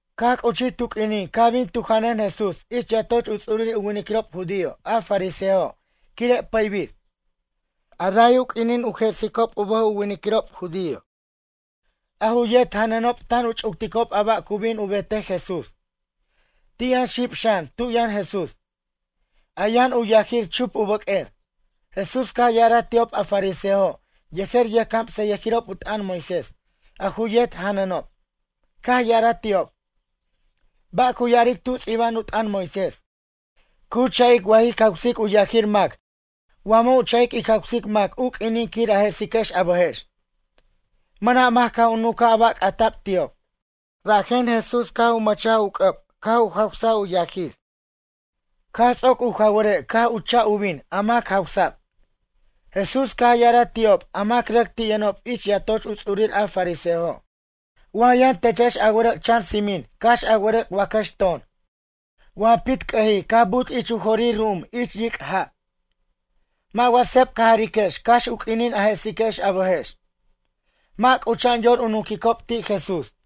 Caj c'uchij tu q'uinin caj bin tu janʌn Jesús ich yatoch u ts'urir u winiquirob judío a fariseojo' quire' pʌybir. Ray u q'uinin u jesicob u bʌj u winiquirob judío. A ju yet janʌnob tan u ch'ucticob a ba' cu bin u betej Jesús. Ti' yʌn xib xan tu yʌn Jesús. A yʌn u yajir chup u bʌq'uer. Jesús caj ya'araj ti'ob a fariseojo' yejer yʌjcamsayʌjirob u t'ʌn Moisés a ju yet janʌnob, caj ya'araj ti'ob: ―Ba' cu ya'aric tu ts'iba'an u t'ʌn Moisés? Cu cha'ic wa jic jawsic u yajir mac wa mʌ' u cha'ic ic jawsic mac u q'uinin quir a jesiquex a bʌjex? Mʌna' mac caj u nuncaj a ba' c'ata'b ti'ob. Rajen Jesús caj u mʌchaj u c'ʌb caj u jawsaj u yajir. Caj ts'oc u jaware' caj u cha' u bin a mac jawsa'b. Jesús caj ya'araj ti'ob a mac rʌc ti' yʌnob ich yatoch u ts'urir a fariseojo': ―Wa yʌn techex a wʌrʌc' chan tsimin cax a wʌrʌc' wacʌx ton, wa pitc'ʌjij caj but' ich u jorir ru'um ich yic' ja', mʌ' wa seb ca jariquex cax u q'uinin a jesiquex a bʌjex? Mʌ' c'ucha'an yor u nunquicob ti' Jesús.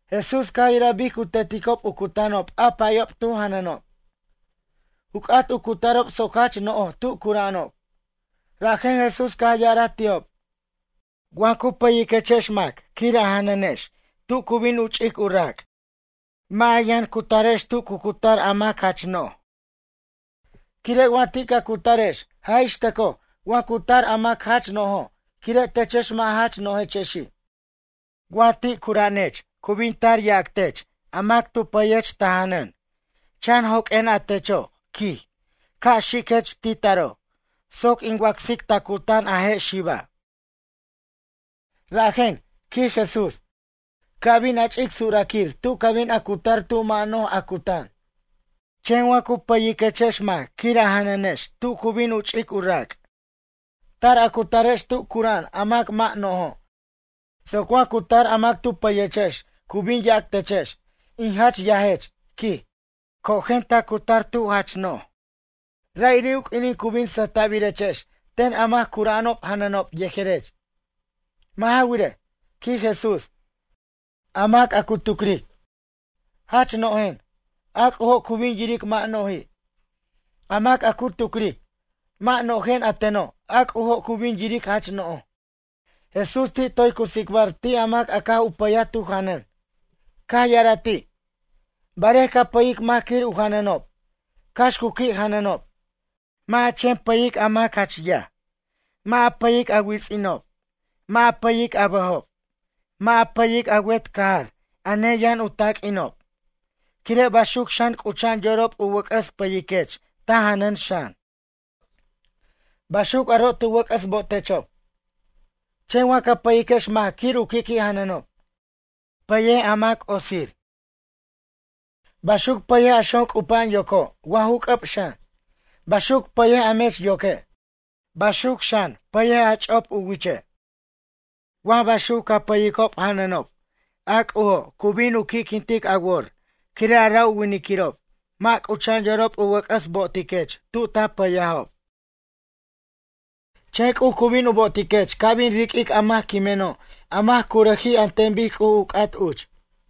Jesús caj yiraj bic cu teticob u cutanob a payob tu janʌnob. U c'at u cutarob soc jach no'j tu cura'anob. Rajen Jesús caj ya'araj ti'ob: ―Wa ju pʌyiquechex mac quir a janʌnex tu cu bin u ch'ic u rac'. Mʌ' ja yʌn cutarex tu cu cutar a mac jach no'j. Quire' wa ti' ca cutarex jaj ixtʌcoj wa cu tar a mac jach no'jo' quire' techex mʌ' jach no'jechexi'. Wa ti' cura'anech cu bin tar yac tech a mac tu pay a janʌn: “Chan joq'uen a techo' ―quij― ca' xiquech ti' taro' soc in wacsic a je' xiba' tera' ta cutan.” Rajen ―quij Jesús―, ca' bin a ch'ic suraquir tu ca bin a cutar tu mʌ' no'j a cutan. Chen wa cu payiquechex mac quir a janʌnex tu cu bin u ch'ic u rac'. Tar a cutarex tu cura'an a mac mʌ' no'jo' soc wa cu tar a mac tu pʌyechex cu bin yac techex: “In jach yajech ―quij―, cojen a cutar tu jach no'j.” Ra'iri' u q'uinin cu bin sʌjta'birechex ten a mac cura'anob janʌnob yejerech. Mʌ' ja wirej ―quij Jesús―, a mac a cu tucric: Jach no'jen, a C'ujo' cu bin yiric mʌ' no'ji'. A mac a cu tucric: Mʌ' no'jen a teno', a C'ujo' cu bin yiric jach no'j. Jesús ti' toy cu tsicbar ti' a mac caj u pʌy tu janʌn. Caj ya'araj ti': ―Barej ca pʌyic mac quir u janʌnob cax cu qui' janʌnob? Mʌ' ja chen pʌyic a mac a jach yaj. Mʌ' ja pʌyic a wits'inob, mʌ' ja pʌyic a bʌjob, mʌ' ja pʌyic a wet cajar a neyʌn u taq'uinob quire' baxuc xan c'ucha'an yorob u wʌc'ʌs pʌyiquech ta janʌn xan. Baxuc aro' tu wʌc'ʌs botechob. Chen wa ca pʌyiquex mac quir u qui' jananob. Pʌyej a mac otsij, baxuc pʌyej a xon c'upa'an yoco' wa ju c'ʌb xan. Baxuc pʌyej a mech yoque'. Baxuc pʌyej a ch'op u wiche' xan. Wa baxuc ca pʌyicob janʌnob a C'ujo' cu bin u qui'quintic a wor quire' a ra' winiquirob mʌ' cucha'an yorob u wʌc'ʌs bo'otiquech tu ta payajexob. Chen C'uj cu bin u bo'otiquex ca' bin riq'uic a mac quimeno' a mac curʌjij an ten bic C'uj u c'at uch.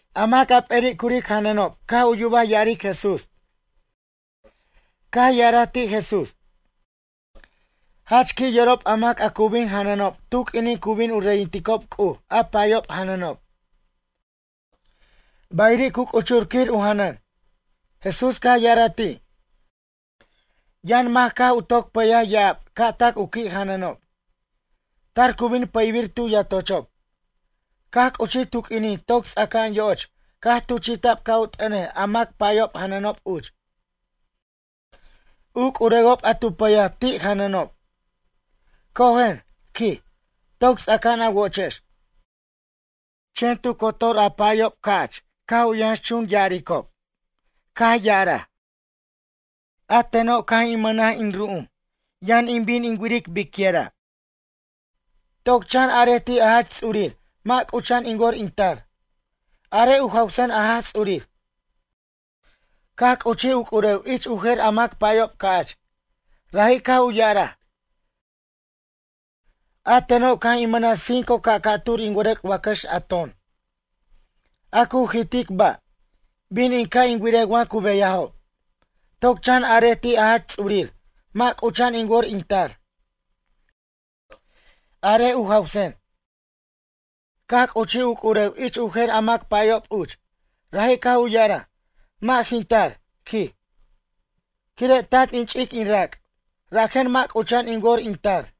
A mac a p'eri' curic janʌnob a caj u yubaj ya'aric Jesús caj ya'araj ti' Jesús: ―Jach qui' yorob a mac a cu bin janʌnob tu q'uinin cu bin u reyinticob C'uj a payob janʌnob. Ba'iri' cu c'uchur quir u janʌn. Jesús caj ya'araj ti': ―Yʌn mac caj u toc pʌyaj ya'ab ca' tac u qui' janʌnob. Tar cu bin pʌybir tu yatochob. Caj c'uchij tu q'uinin toc ts'aca'an yo'och caj tuchi'ta'b ca' u t'ʌnej a mac payob janʌnob uch. U c'urewob a tu pʌyaj ti' janʌnob: “Cojen ―quij―, toc ts'aca'an a wochex.” Chen tu cotor a payob ca'ch caj u yʌnxchun ya'arob. Biquinin mʌ' c'ucha'an yor u binob, a tu yʌn c'uch, caj ya'araj: “A teno' caj in mʌnaj in ru'um, yʌn in bin in wiric biquira'. Toc chan arej ti' a jach ts'urir mʌ' c'ucha'an in wor in tar. Arej u jawsen a Jaj Ts'urir.” Caj c'uchij u c'urew ich u jer a mac payob ca'ch. Raji' caj u ya'araj: “A teno' caj in mʌnaj cinco ca' ca'tur in wʌrʌc' wacʌx a ton, a cu jitic ba'. Bin in ca' in wirej wa cu beyajob. Toc chan arej ti' a Jach Ts'urir mʌ' c'ucha'an in wor in tar. Arej u jawsen.” Caj c'uchij u c'urew ich u jer a mac payob uch. Raji' caj u ya'araj: “Mʌ' jin tar ―quij―, quire' tant in ch'ic in rac', rajen mʌ' c'ucha'an in wor in tar.”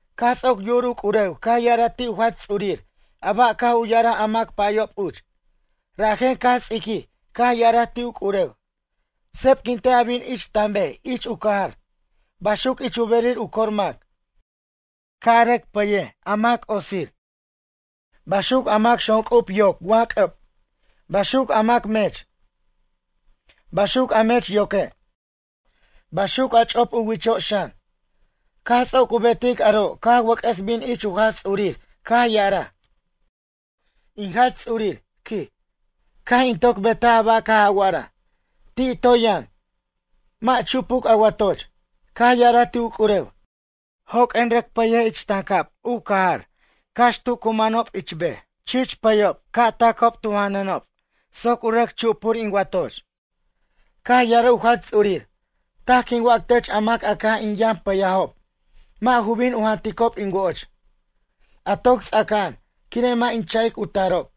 Caj ts'oc yu'ur u c'urew caj ya'araj ti' u Jach Ts'urir a ba' caj u ya'araj a mac payob uch. Rajen caj ts'iquij caj ya'araj ti' u c'urew: “Sebquintej a bin ich tanbej ich u cajar, baxuc ich u berir u cor mac. Ca' a rʌc pʌyic a mac otsir. Baxuc a mac xonc'ub yoc wa c'ʌb. Baxuc a mac mech. Baxuc a mech yoque'. Baxuc a ch'op u wicho' xan.” Caj ts'oc u betic aro' caj wʌc'ʌs bin ich u Jach Ts'urir caj ya'araj: “In Jach Ts'urir ―quij―, caj in toc betaj a ba' caj a wa'araj. Ti' toy yʌn, mʌ' chupuc a watoch.” Caj ya'araj ti' u c'urew: “Joq'uen, rʌc pʌyej ich tancab u cajar cax tu cu manob ich bej. Chich pʌyob ca' tacob tu janʌnob soc u rʌc chupur in watoch.” Caj ya'araj u Jach Ts'urir: “Taj quin wac tech a mac a caj in yʌn pʌyajob, mʌ' ju bin u janticob in woch. A toc ts'aca'an, quire' mʌ' in cha'ic u tarob.”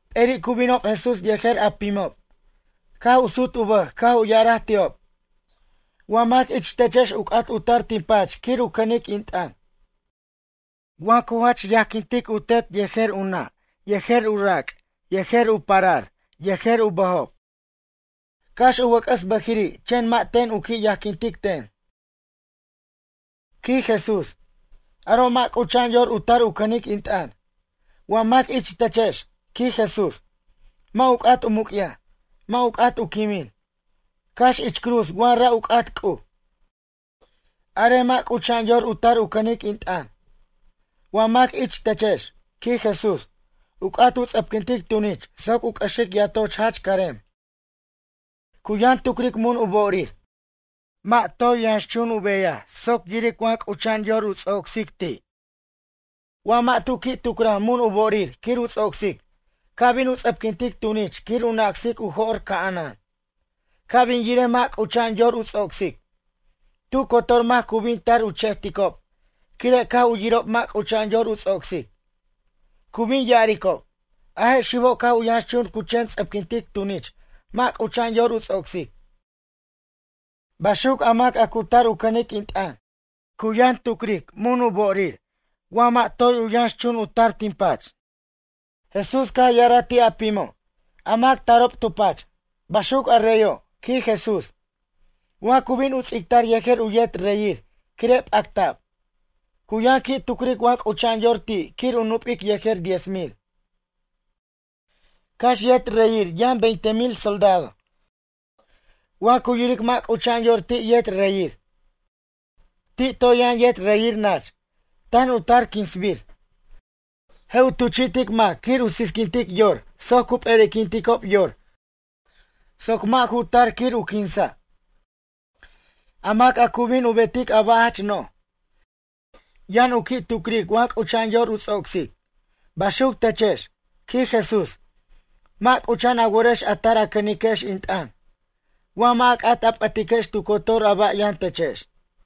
P'eri' cu binob Jesús yejer a pimob. Caj u sut u bʌj caj u ya'araj ti'ob: ―Wa mac ich techex u c'at u tar tin pach quir u cʌnic in t'ʌn. Wa ju jach yajquintic u tet yejer u nʌ' yejer u rac' yejer u parar yejer u bʌjob. Cax u wʌc'ʌs bʌjiri' chen mʌ' ten u qui' yajquintic ten ―quij Jesús―, aro' mʌ' c'ucha'an yor u tar u cʌnic in t'ʌn. Wa mac ich techex ―quij Jesús―, mʌ' u c'at u muc'yaj, mʌ' u c'at u quimin, cax ich cruz wa ra' u c'at C'uj. Arej mʌ' c'ucha'an yor u tar u cʌnic in t'ʌn. Wa mac ich techex ―quij Jesús―, u c'at u ts'ʌpquintic tunich soc u c'ʌxic yatoch jach carem. Cu yʌn tucric mun u bo'orir, mʌ' toy yʌnchun u beyaj soc yiric wa c'ucha'an u ts'ocsic ti'. Wa mʌ' tu qui' tucraj mun u bo'orir quir u ts'ocsic ca' bin u ts'ʌpquintic tunich quir u nacsic u jo'r ca'anan. Ca' bin yirej mʌ' c'ucha'an yor u ts'ocsic. Tu cotor mac cu bin tar u che'ticob quire' caj u yirob mʌ' c'ucha'an yor u ts'ocsic. Cu bin u ya'aricob: “A je' xibo' caj u yʌnxchun cu chen ts'ʌpquintic tunich mʌ' c'ucha'an yor u ts'ocsic.” Baxuc a mac a cu tar u cʌnic in t'ʌn. Cu yʌn tucric mun u bo'orir wa toy yʌnxchun u tar tin pach. Jesús caj ya'araj ti' a pimo', a mac tarob tu pach: ―Baxuc a reyo' ―quij Jesús―, wa cu bin u ts'ictar yejer u yet reyir quire' p'acta'b. Cu yʌn qui' tucric wa c'ucha'an yor ti' quir u nup'ic yejer diez mil, cax yet reyir yʌn veinte mil soldado. Wa cu yiric mʌ' c'ucha'an yor ti' yet reyir. Ti' toy yʌn yet reyir nach, tan u tar quinsbir. Je' u tuchi'tic mac quir u sisquintic yor soc cu p'eri'quinticob yor soc mʌ' ju tar quir u quinsa'. A mac a cu bin u betic a ba' jach no'j, yʌn u qui' tucric wa c'ucha'an yor u ts'ocsic. Baxuc techex ―quij Jesús―, mʌ' c'ucha'an a worex a tar a cʌniquex in t'ʌn, wa mʌ' a c'at a p'ʌtiquex tu cotor a ba' yʌn techex.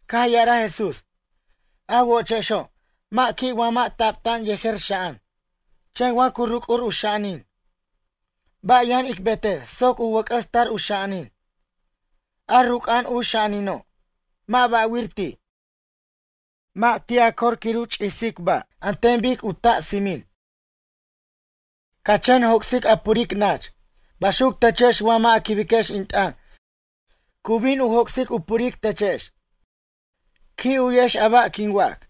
Caj ya'araj Jesús: ―A wochexo', mʌ' qui' wa mʌ' tabta'an yejer xa'an. Chen wa cu ruc'ur u xa'anin. Ba' yʌn ic betej soc u wʌc'ʌs tar u xa'anin? A ruc'a'an u xa'anino', mʌ' ba'wir ti', mʌ' ti' a cor quir u ch'isej ba' an ten bic u ta' tsimin, ca chen joc'sic a puric nach. Baxuc techex wa mʌ' a quibiquex in t'ʌn cu bin u joc'sic u puric techex. Qui' u'yex a ba' quin wac.